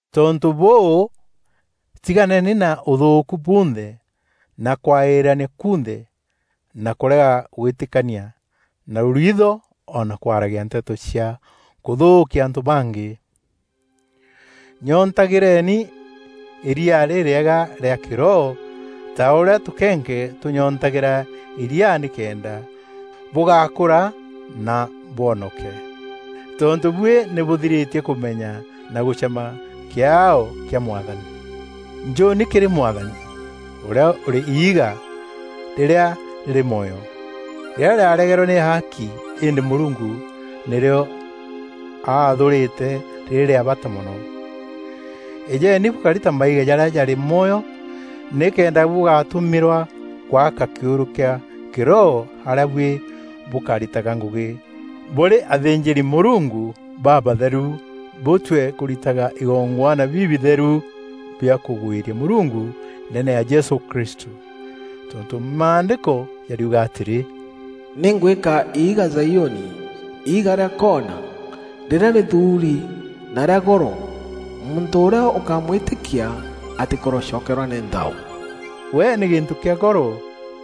Tontû bûû, tiganeni na ûthûûku bunthe na kwaîîrania kunthe na kûrega gwîtîkania na rûriitho o na kwaragia nteto cia kûthûûkia antû bangî. Nyontagîreni îria rîrîega rîa kîroho ta ûrîa tûkenke tûnyoontagîra îria nîkenda bûgakûra na bwonoke. Tontû buî nî bûthirîtie kûmenya na gûcema kîaao kîa Mwathani. Njûni kîrî Mwathani, ûrîa ûrî iiga rîrîa rîrî mwoyo, rîrîa rîaregerwe nî aaki îndî Mûrungu nîrîo athuurîte rîrî rîa bata mono. Îjeni bûkari ta maiga jarîa jarî mwoyo nîkenda bûgatumîrwa gwaka kîûrû kîa kîroho arîa buî bûkaritaga ngûgî bûrî athînjîri-Mûrungu babatheru bûtue kûritaga igongwana bibitheru bia kûgwîria Mûrungu ndeene ya Jesû Kristû. Tontû Maandîko jariuga atîrî, “Nî ngwîka iiga Zaiûni, iiga rîa koona, rîrîa rîthuuri na rîa goro, muntû ûrîa ûkamwîtîkia, atîkorocokerwa nî nthao.” We nî gîntû kîa goro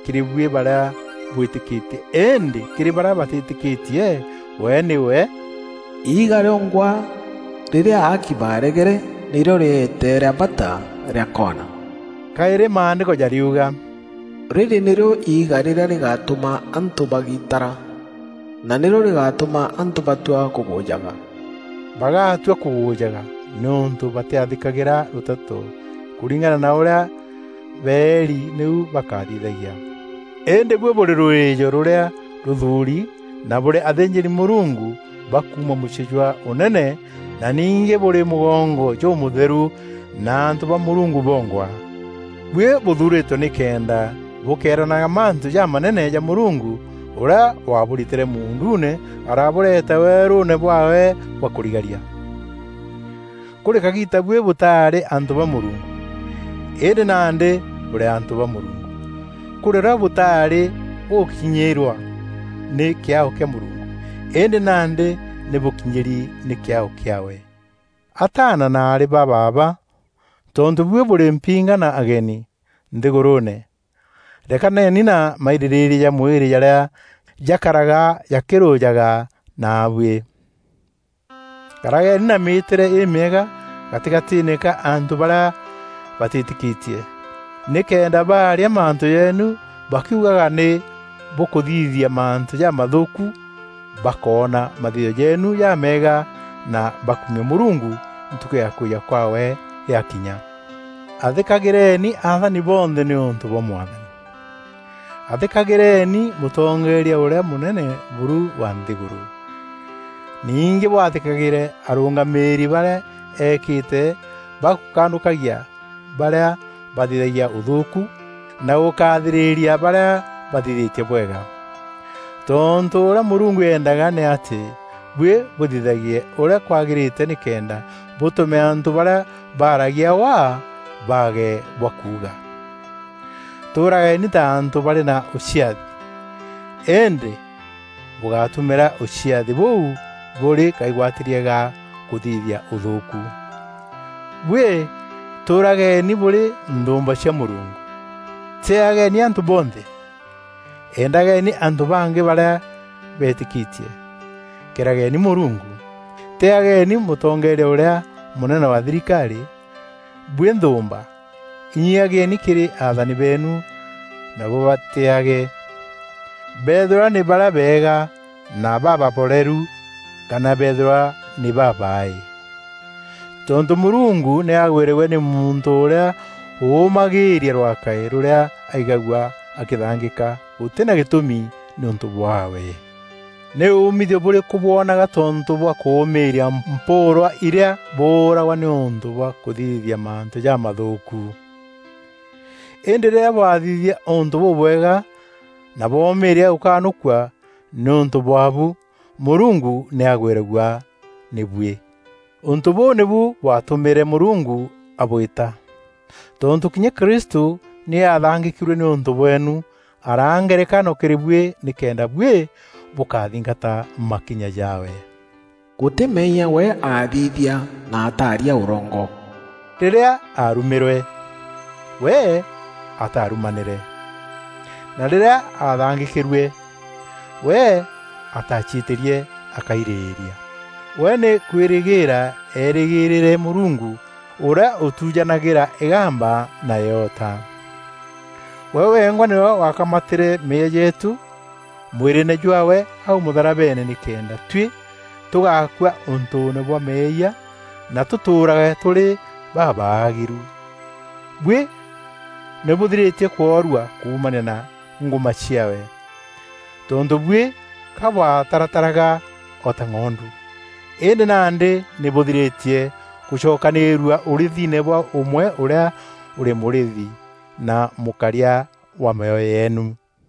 kîrî buî barîa bwîtîkîtie îndî kîrî barîa batîtîkîtie we nîwe, “Iiga rîongwa rîrîa aaki baaregere, nîrîo rîeete rîa bata rîa kona.” Kaîrî Maandîko jariuga, “Rîrî nîrîo iiga rîrîa rîgatûma antû bagiitara na nîrîo rîgatûma antû batua kûgûjaga.” Bagatua kûgûjaga nîûntû batîathîkagîra rûteto kûringana na ûrîa beeri nîu bakathithagia. Îndî buî bûrî rûrîîjo rûrîa rûthuuri na bûrî athînjîri-Mûrungu ba kuuma mûciî jwa ûnene na ningî bûrî mûgongo jûmûtheru na antû ba Mûrungu bongwa. Buî bûthuurîtwe nîkenda bûkeeranaga mantû jamanene ja Mûrungu ûrîa waabûritîre muunduune aarabûreta weerûûne bwaawe bwa kûrigaria. “Kûrî kagiita buî bûtaarî antû ba Mûrungu, îndî nandî bûrî antû ba Mûrungu; kûrî rîo bûtaarî bûgûkinyîrwa nî kîaao kîa Mûrungu, îndî nandî nî bûkinyîri nî kîaao kîaawe.” Ataana na aarî ba baaba, tontû buî bûrî mpinga na ageni nthîgûrûûne, rekaneni na mairîrîîria ja mwîrî jarîa jakaraga jakîrûjaga naabuî. Karageni na mîîtîre îmîega gatîgatîîne ka antû barîa batîtîkîtie. Nîkenda baaria mantû jeenu bakiugaga nî bûkûthithia mantû jamathûûku, bakoona mathithio jeenu jameega na bakumie Mûrungu Ntukû ya kwîja kwaawe yakinya. Athîkagîreeni athani bonthe nîûntû bwa Mwathani. Athîkagîreeni mûtongeeria ûrîa mûnene buru wa nthîgûrû, ningî bwathîkagîre arûngamîîri barîa eekîte ba gûkanûkagia barîa bathithagia ûthûûku na gûkathîrîria barîa bathithîtie bwega. Tontû ûrîa Mûrungu eendaga nî atî buî bûthithagie ûrîa kwagîrîte nîkenda bûtûme antû barîa baragia waa baage bwa kuuga. Tûûrageni ta antû barî na ûciathi, îndî bûgátumîra ûciathi bûû bûrî kaigwatîrie ga kûthithia ûthûûku. Buî tûûrageni bûrî nthûûmba cia Mûrungu. Tîîageni antû bonthe. Endageni antû bangî barîa betîkîtie. Kîrageni Mûrungu. Tîîageni mûtongeeria ûrîa mûnene wa thirikarî. Buî nthûûmba, inyiiagieni kîrî athani beenu na bûbatîîage. Beethîrwa nî barîa beega na bababoreru kana beethîrwa nî babaaî. Tontû Mûrungu nî agwîragua nî muntû ûrîa ûûmagîîria rwakaî rûrîa aigagua akîthangîka gûtî na gîtûmi nîûntû bwaawe. Nî umithio bûrîkû bwonaga tontû bwa kûûmîîria mpûûrwa irîa bûûragwa nîûntû bwa kûthithia mantû jamathûûku? Îndî rîrîa bwathithia ûntû bûbwega na bwomîîria gûkanûkua nîûntû bwaabu, Mûrungu nî agwîragua nî buî. Ûntû bûu nîbu bwatûmîre Mûrungu abwîta. Tontû kinya Kristû nî aathangîkîrue nîûntû bweenu, araa ngerekano kîrî buî nîkenda buî bûkathingata makinya jaawe. Gûtî meeyia we aathithia na ataaria ûrongo. Rîrîa aarumîrwe, we ataarumanîre, na rîrîa aathangîkîrue, we ataaciîtîrie akairîîria. We nî kwîrîgîîra eerîgîîrîre Mûrungu ûrîa ûtujanagîra îgamba na îota. We wengwa nîwe wakamatîre meeyia jeetû mwîrîîne jwaawe au mûtharabeene nîkenda tuî tûgakua ûntûûne bwa meeyia na tûtûûrage tûrî babaagîru. Buî nî bûthirîtie kworua kuumania na ngûma ciaawe. Tontû buî ka bwatarataraga o ta ng'ondu, îndî nandî nî bûthirîtie gûcokanîîrua ûrîîthine bwa ûmwe ûrîa ûrî Mûrîîthi na Mûkaria wa mîoyo yeenu.